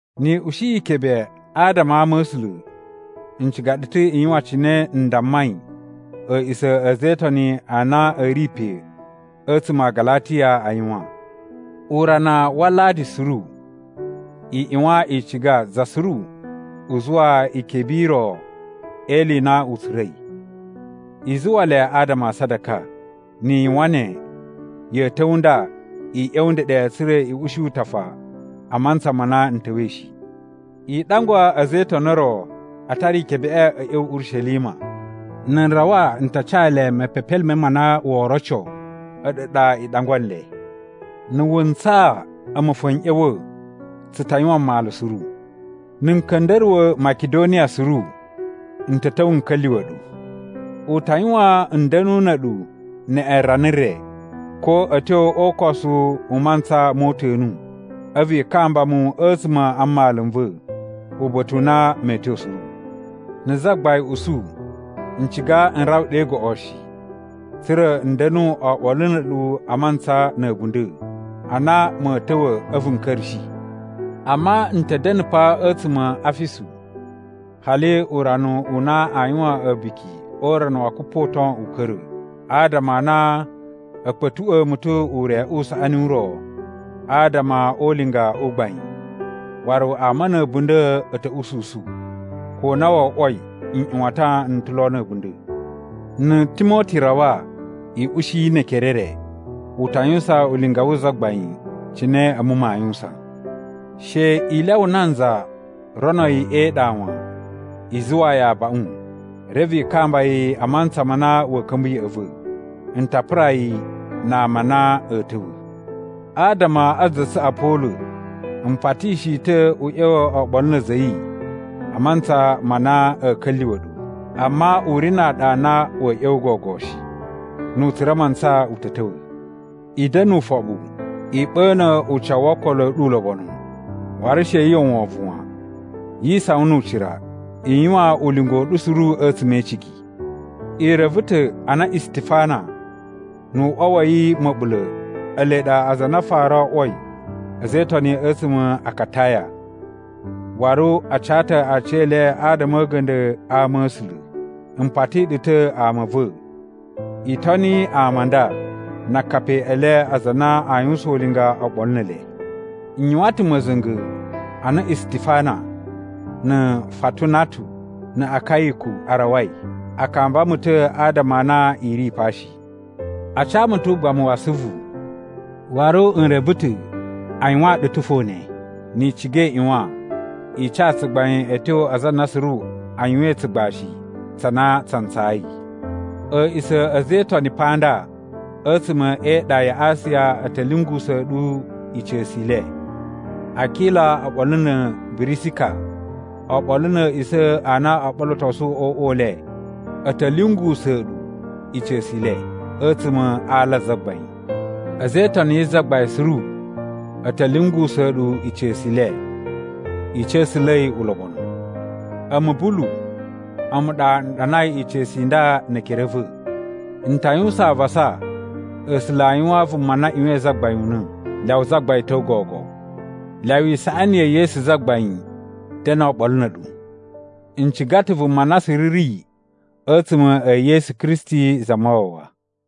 Ni i ushi ikebe adama a ama a̱ A̱sula̱, n ciga ɗu ta̱ i yuwan cine n dammai a̱a̱ꞌisa̱ a̱ a̱za̱ e Itoni a na a̱ ri pe a̱tsuma̱ a Galatiya a yuwan. Urana wa Aladi suru i ꞌyuwan i ciga za suru u zuwa ikebe i ro e ili i na u tsura̱i. I zuwa le adama a sadaka. Ni i yuwan ne, ya̱a̱ ta̱wa̱ nda i ꞌya̱wa̱ ndeɗe tsa̱ra̱ i ushi utafa a mantsa ma na n ta̱wa̱i shi. I ɗangwa a̱za̱ e Itoni o ro a tara ikebeꞌe a̱ ꞌya̱wa̱ Urishelima. Na̱ n rawa n ta ca le mepepelime ma na woo roco a̱ɗu ɗa i ɗangwa nle. Na̱ wu ntsaa a̱mu fo n ꞌya̱wa̱, tsu ta yuwan mmalu suru. Na̱ n ka̱nda̱ruwa̱ Makidoniya suru, n ta̱ ta̱wa̱ n ka̱lyuwa̱ ɗu. U ta yuwan n da̱nu na̱ a̱ɗu neꞌen rana re, ko a̱ tyo o ukosu u mantsa mo uta̱nu. A̱vu i kamba mu a̱tsuma̱ a mmalu n va̱, uba̱ta̱ u na mee tyo suru. Na̱ Zagbain usu, n ciga n rawa ɗe goꞌo shi, tsa̱ra̱ n da̱nu oɓolo na̱ a̱ɗu a mantsa na̱ a̱bunda̱ a na ma̱a̱ ta̱wa̱ a̱vu n ka̱ra̱shi. Amma n ta̱ da̱na̱ pa a̱tsuma̱ a Afisu hali urana u na aa yuwan A̱buki o Urana wa Kupoton u ka̱ra̱. Adama a na a̱ kpa̱tuꞌwa̱a̱ mu ta̱ ure u saꞌani u ro adama o ulinga u gbain, waru ama na̱ a̱bunda̱ a̱ ta̱ ususu, ko na wo oꞌwoi nꞌyuwatan n ta̱ lo na̱ a̱bunda̱. Na̱ Timoti rawa, i ushi yi ne ekere e re. U ta yuwusan ulinga wu Zagbain, cine a̱mu maa yuwusan. She i lyawa nanza rono yi e iɗa wan. I zuwaa yi abaꞌun reve i kamba yi a mantsa ma na wa̱a̱ ka̱mba̱ ya̱ꞌa̱ va̱. N ta pura yi na ama a na a̱a̱ ta̱wa̱. Adama a za tsu Apolo, m patishi yi ta̱ u ꞌya̱wa̱ oɓolo na̱ a̱za̱ a̱ yi a mantsa ma na a̱a̱ ka̱lyuwa̱ ɗu, amma u ri na aɗa a na wa̱a̱ ꞌya̱wa̱ gogo shi. Nu u tsura̱ mantsa u ta̱ ta̱wa̱. I da̱na̱ ufoɓu. I ɓa̱na̱ ucawu wo okolo a̱ ɗu ulobonu. Waru she yu uwwa wovon wan. Yi isawan nu ucira. I yuwan ulinga u ɗu suru a̱tsuma̱ e icigi. I reve ta̱ a na Istifana nu uꞌwa wa̱ yi ma̱ɓula̱ ele ɗa aza a na a fara o oꞌwoi a̱za̱ e Itoni a̱tsuma̱ a Akataya, waru a ca ta̱ aciyele adama a̱ a̱ga̱nda̱ a ama a̱ A̱sula̱. M pati ɗu ta̱ ama a̱ va̱, i toni ama a nda na akapi e le aza a na a yuwusan ulinga oɓolo ne ele. N yuwan ta̱ ma̱za̱nga̱ a na Istifana, na̱ Fatunatu na̱ Akayiku a rawai. A kamba mu ta̱ adama a na i ri pa shi. A ca mu ta̱ ugbamu wa asuvu, waru n reve ta̱ a yuwaan ɗu ta̱ fo ne. Ni i ciga i ꞌyuwan i ca tsugbain a̱ tyo aza a na suru a yuwain tsugbashi tsa na tsa ntsayi. A̱a̱ꞌisa̱ a̱ a̱za̱ e Itoni pa nda a̱tsuma̱ e iɗa ya Asiya a̱ ta̱ lyungusa̱a̱ ɗu ica̱su i le. Akila oɓolo na̱ Birisika, oɓolo na̱ a̱a̱ꞌisa̱ a na o ɓolotosu o uꞌwa u le, a̱ ta̱ lyungusa̱a̱ ɗu ica̱su i le a̱tsuma̱ a ala a Zagbain. A̱za̱ e Itoni yi Zagbain suru a̱ ta̱ lyungusa̱a̱ ɗu ica̱su i le. I ca̱sa̱la̱i ulobonu. A̱mu Bulu, a̱mu ɗa n ɗanai ica̱su i nda ne ekere a̱ va̱. N ta yuwusan avasa A̱sula̱ a yuwaan vuma na ꞌyuwain Zagbain una̱. Lyawa Zagbain ta̱wa̱ gogo. Lyawa isaꞌani ya̱ Yesu Zagbain da̱na̱ oɓolo na̱ a̱ɗu. N ciga ta̱ vuma na suru ri a̱tsuma̱ e Yesu Kristi Zamawawa.